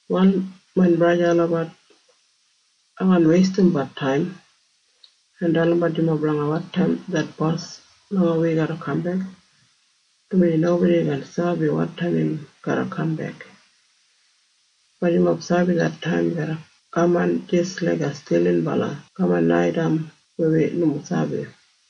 Wal main braja en sista olabat, ai kaan weistimbat taim en dalimbat yumob blanga wotaim det Bos blanga wi garra kambek, dumaji nobodi kaan sabi wotaim im garra kambek. Bat yumob sabi det taim garra kaman jis laiga stilinbala kaman naitaim weya wi nomo sabi.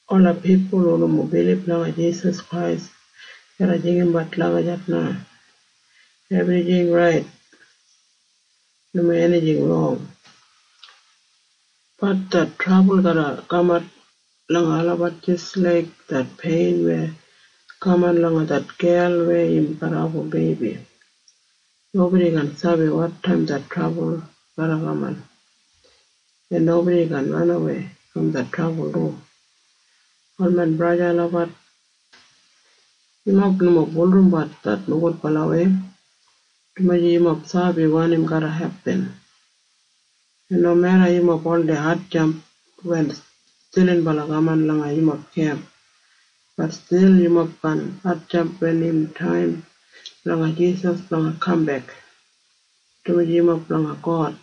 Ola pipul hu nomo bilib langa Jisas Krais garra jinggabat lagijat na, “Ebrijing rait. Nomo enijing rong.” Bat det trabul garra kamat langa olabat jis laik det pein weya kaman langa det wuman weya im garra abum beibi. Nobodi kaan sabi wotaim det trabul garra kaman, en nobodi kaan ranawei brom det trabul du. Wal main braja en sista olabat, yumob nomo bulurrumbat det nogudbalawei, dumaji yumob sabi wanim garra hepin. En nomeda yumob oldei hatjamp wen stilinbala kaman langa yumob kemp, bat stil yumob kaan hatjamp wen im taim blanga Jisas blanga kambek, dumaji yumob blanga God,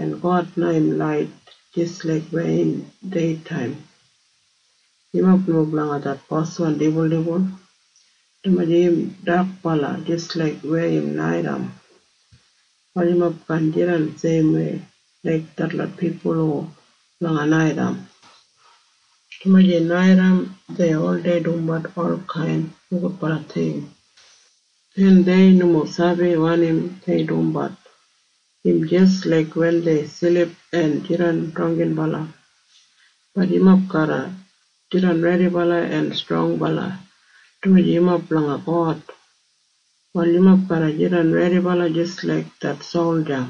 en God na im lait jis laik weya im deitaim. Yumob nomo blanga det boswan dibuldibul, dumaji im dakbala jis laik weya im naitaim. Wal yumob kaan jidan seimwei laik detlot pipul hu blanga naitaim, dumaji naitaim dei oldei dumbat olkain nogudbala ting, en dei nomo sabi wanim dei dumbat. Im jis laik wen dei silip en jidan drangginbala. Bat yumob garra jidan redibala en strongbala, dumaji yumob blanga God. Wal yumob garra jidan redibala jis laik det solja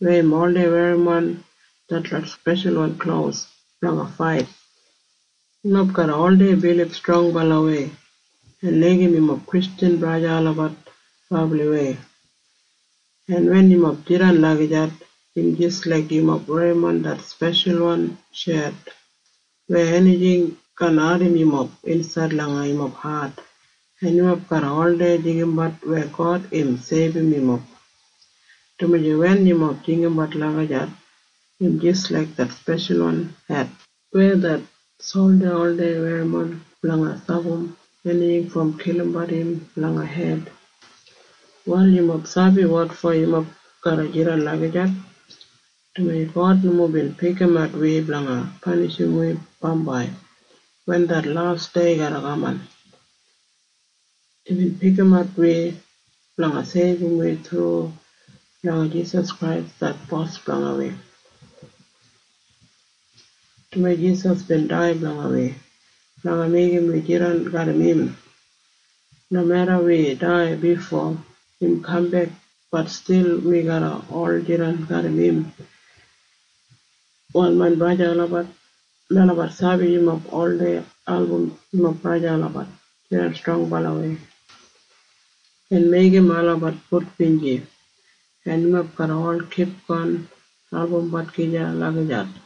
weya im oldei werrimon detlot speshalwan klos blanga fait. Yumob garra oldei bilib strongbalawei en laigim yumob Kristjan braja en sista olabat brabliwei. En wen yumob jidan lagijat, im jis laik yumob werrimon det speshalwan shet weya enijing kaan ardim yumob insaid langa yumob hat. En yumob garra oldei jinggabat weya God bin seibum yumob, dumaji wen yumob jinggabat lagijat, im jis laik det speshalwan het weya det solja oldei werrimon blanga stapam enijing brom kilimbat im langa hed. Wal yumob sabi wotfo yumob garra jidan lagijat? Dumaji God nomo bin pikimat wi blanga panishim wi bambai wen det las dei garra kaman. Imbin pikimat wi blanga seibum wi thru langa Jisas Krais det Bos blanga wi, dumaji Jisas bin dai blanga wi blanga meigim wi jidan garram im. Nomeda wi dai bifo im kambek, bat stil wi garra ol jidan garram im. Wal main braja en sista olabat, melabat sabi yumob oldei album yumob braja en sista olabat jidan strongbalawei en meigim olabat gudbinji, en yumob garra ol kipgon albumbat gija lagijat.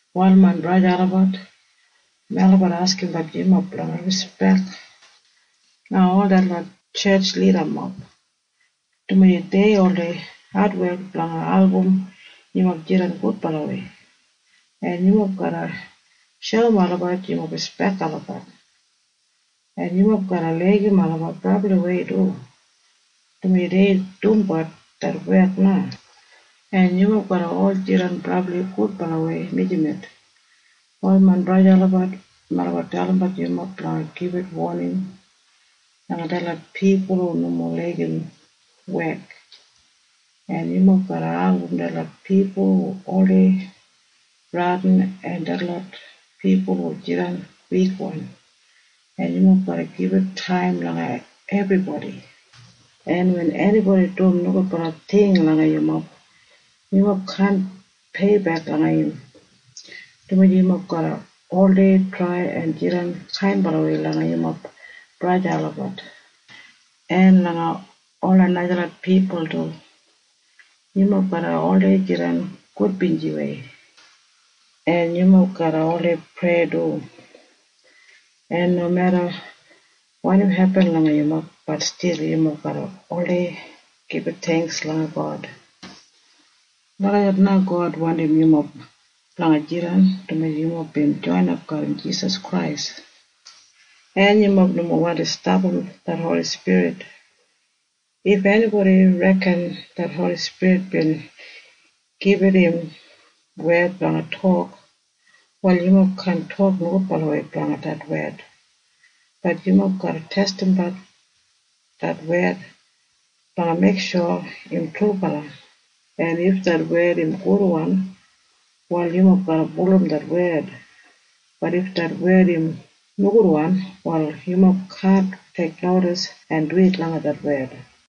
Wal main braja en sista olabat, melabat askimbat yumob blanga rispek langa ol detlot tjetj lidamob, dumaji dei oldei adwek blanga album yumob jidan gudbalawei, en yumob garra shoum olabat yumob rispek olabat, en yumob garra laigim olabat brabliwei du, dumaji dei dumbat det wek na, en yumob garra ol jidan brabli gudbalawei mijamet. Wal main braja en sista olabat, melabat dalimbat yumob blanga gibit woning langa detlot pipul hu nomo laigim wek. En yumob garra album detlot pipul hu oldei bradin en detlot pipul hu jidan wikwan. En yumob garra gibit taim langa ebribodi. En wen enibodi dum nogudbala ting langa yumob, yumob kaan peibek langa im, dumaji yumob garra oldei trai en jidan kainbala langa yumob braja en sista olabat en langa ola najalot pipul du. Yumob garra oldei jidan gudbinjiwei, en yumob garra oldei prei du, en nomeda wanim hepin langa yumob, bat stil yumob garra oldei gibit theingks langa God. Lagijat na God wandim yumob blanga jidan, dumaji yumob bin joinap garram Jisas Krais. En yumob nomo wandi stapam det Holi Spirit. If enibodi reken det Holi Spirit bin gibit im wed blanga tok, wal yumob kaan tok nogudbalawei blanga det wed. Bat yumob garra testimat det wed blanga meiksho im trubala. En if det wed im gudwan, wal yumob garra bulurrum det wed. Bat if det wed im nogudwan, wal yumob kaan teiknodis en duwit langa det wed.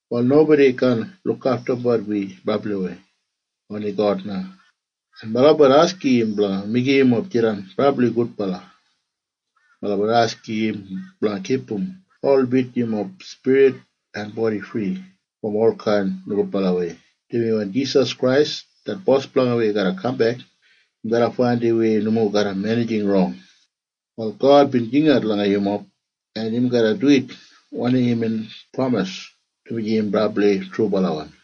Wal nobodi kaan lukaftumbat wi brabliwei. Oni God na. En melabat askim im blanga meigim yumob jidan brabli gudbala, en melabat askim im blanga kipum holbit yumob spirit en bodi fri brom olkain nogudbalawei, dumaji wen Jisas Krais det Bos blanga wi garra kambek, im garra faindim wi nomo garram enijing rong. Wal God bin jingat langa yumob, en im garra duwit wanim imbin pramis, dumaji im brabli trubalawan.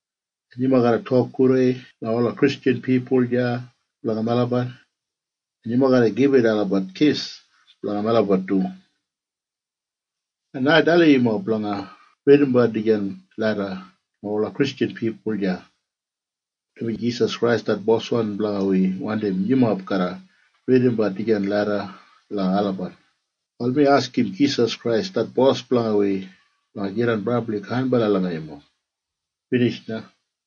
En yumob garra tok gudei langa ola Kristjan pipul deya blanga melabat, en yumob garra gibit olabat kis blanga melabat du. En ai dalim yumob blanga ridimbat dijan leda langa ola Kristjan pipul deya, dumaji Jisas Krais det Bos blanga wi wandim yumob garra ridimbat dijan leda langa olabat. Wal mi askim Jisas Krais det Bos blanga wi blanga jidan brabli kainbala langa yumob. Binij na.